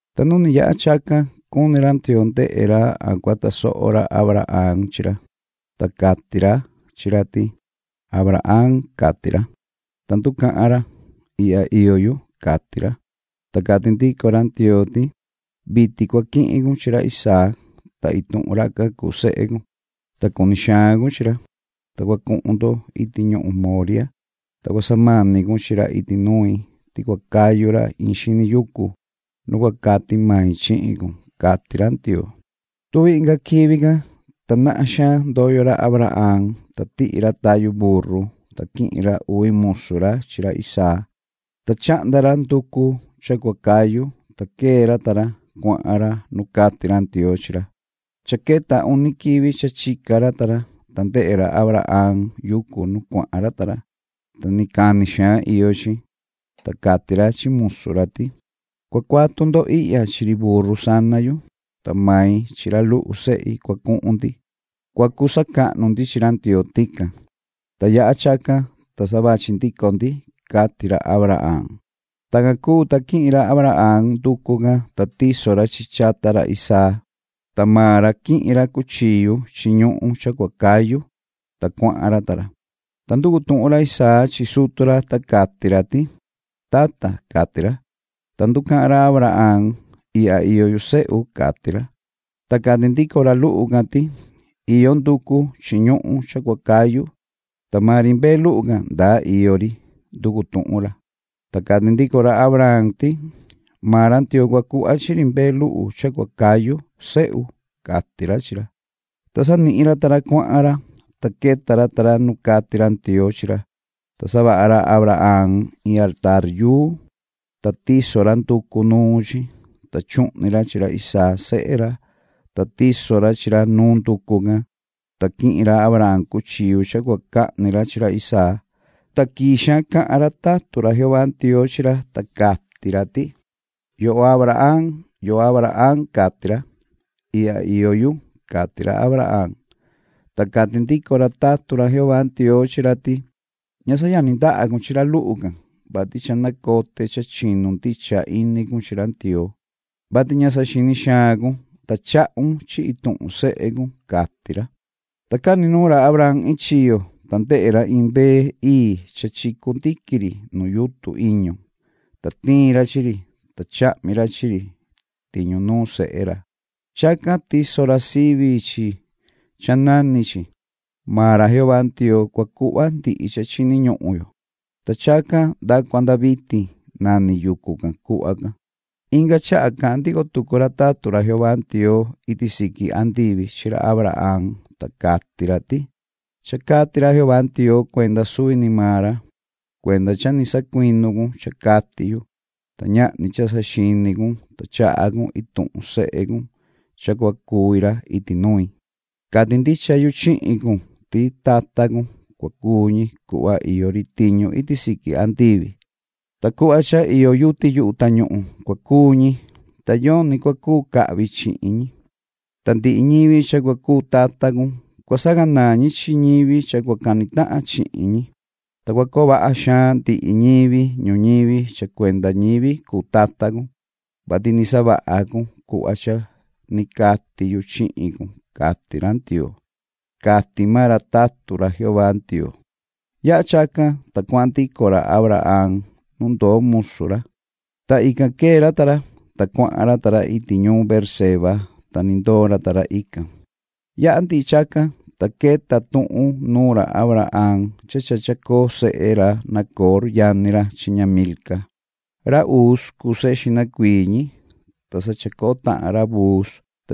Ta nu ni yaha chacan cuni ra Ndioo ndehe ra a cua tasoho ra Abraham chi ra. Ta cati ra, chi ra ti: ―Abraham ―cati ra. Ta nducahan ra: ―Ihya iyo yu ―cati ra. Ta cati ndico ra Ndioo ti: ―Vitin cua quihin cun chi ra Isaac, ta ituhun racan cuu sehe cun, ta cuni xaan cun chi ra, ta cua cuhun ndo iti ñuhun Moriah, ta cua samani cun chi ra iti nui ti cua cayu ra in xini yucu nu cua cati mai chihin cun ―cati ra Ndioo. Tuvi inga quivi can, ta nahan xaan ndoyo ra Abraham, ta tihi ra tayu burru, ta quihin ra uvi musu ra chi ra Isaac, ta chahnda ra nducu cha cua cayu, ta quee ra ta ra, cuahan ra nu cati ra Ndioo chi ra. Cha queta uni quivi cha chica ra ta ra, ta ndehe ra Abraham yucu nu cuahan ra ta ra, ta ni cani xaan iyo chi. Ta cati ra chi musu ra ti: ―Cua cuatu ndo ihya chi ri burru sana yu, ta mai chi ra luhu sehi cua cuhun ndi. Cua cu sacahnu ndi chi ra Ndioo tican, ta yaha chacan, ta sa vachi ndico ndi ―cati ra Abraham. Tacan cuu, ta quihin ra Abraham nducu can, ta tiso ra chi chi chata ra Isaac, ta maan ra quihin ra cuchillu chi ñuhun cha cua cayu, ta cuahan ra ta ra. Ta nducu tuhun ra Isaac chi sutu ra, ta cati ra ti: ―Tata ―cati ra. Ta nducahan ra Abraham: ―Ihya iyo yu, sehu ―cati ra. Ta cati ndico ra luhu can ti: ―Iyo nducu chi ñuhun cha cua cayu ¿ta maan ri mbee luhu can, ndaa iyo ri? ―nducu tuhun ra. Ta cati ndico ra Abraham ti: ―Maan ra Ndioo cua cuhva chi ri mbee luhu cha cua cayu, sehu ―cati ra chi ra. Ta sanihin ra ta ra cuahan ra. Ta queta ra ta ra nu cati ra Ndioo chi ra, ta savaha ra Abraham in altaar, ta tiso ra nducu nuun chi, ta chuhni ra chi ra Isaac sehe ra, ta tiso ra chi ra nuun nducu can. Ta quihin ra Abraham cuchillu cha cua cahni ra chi ra Isaac. Ta quii xaan cahan ra tatun ra Jehová Ndioo chi ra, ta cati ra ti: ―Yoho Abraham, yoho Abraham ―cati ra. ―Ihya iyo yu ―cati ra Abraham. Ta cati ndico ra tatun ra Jehová Ndioo chi ra ti: ―Ña sayani ndaha cun chi ra luhu can, vati cha nacote cha chinu ndicha ini cun chi ra Ndioo, vati ña saxini xaan cun, ta chahun chi ituhun sehe cun ―cati ra. Ta cani nuun ra Abraham iin chiyo, ta ndehe ra iin mbee ii cha chicu ndiqui ri nu yutun iñu, ta tiin ra chi ri, ta chahmi ra chi ri tiñu nuun sehe ra. Chacan tiso ra sivi chi cha nani chi “Maan ra Jehová Ndioo cua cuhva ndihi cha chini ñuhun yo.” Ta chacan nda cua nda vitin nani yucu can cuhva can. Inga chaha cahan ndico tucu ra tatun ra Jehová Ndioo iti siqui andivi chi ra Abraham. Ta cati ra ti: ―Cha cati ra Jehová Ndioo cuenda suvi ni maan ra: ‘Cuenda cha ni sacuinu cun cha cati yu, ta ñahni cha saxini cun, ta chaha cun ituhun sehe cun cha cua cuvi ra iti nui. Cati ndicha yu chihin cun ti tata cun cua cuu ñi cuhva iyo ri tiñu iti siqui andivi. Ta cuhva cha iyo yuti yuhu tañuhun cua cuu ñi, ta yoni cua cuu cahvi chihin ñi. Ta ndihi ñivi cha cua cuu tata cun, cua sacanaan ñi chi ñivi cha cua cani tahan chihin ñi. Ta cua coo vaha xaan ndihi ñivi ñuñivi cha cuenda ñivi cuu tata cun, vati ni savaha cun cuhva cha ni cati yu chihin cun’, cati ra Ndioo ―cati maan ra tatun ra Jehová Ndioo. Yaha chacan, ta cuahan ndico ra Abraham nu ndoo musu ra, ta ican quee ra ta ra, ta cuahan ra ta ra iti ñuun Beerseba, ta ni ndoo ra ta ra ican. Yaha ndihi chacan, ta queta tuhun nuun ra Abraham cha chacoo sehe ra Nacor yani ra chi ña Milca. Ra Uz cuu sehe xihna cuii ñi, ta sa chacoo tahan ra Buz,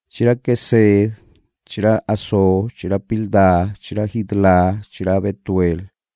chi ra Quesed chi ra Hazo chi ra Pilda chi ra Jidlaf chi ra Betuel.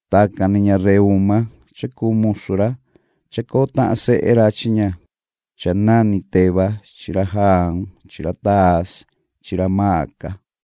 Tacan ni ña Reúma cha cuu ñasihi ra, chacoo tahan sehe ra chi ña cha nani Teba chi ra Gaham chi ra Tahas chi ra Maca.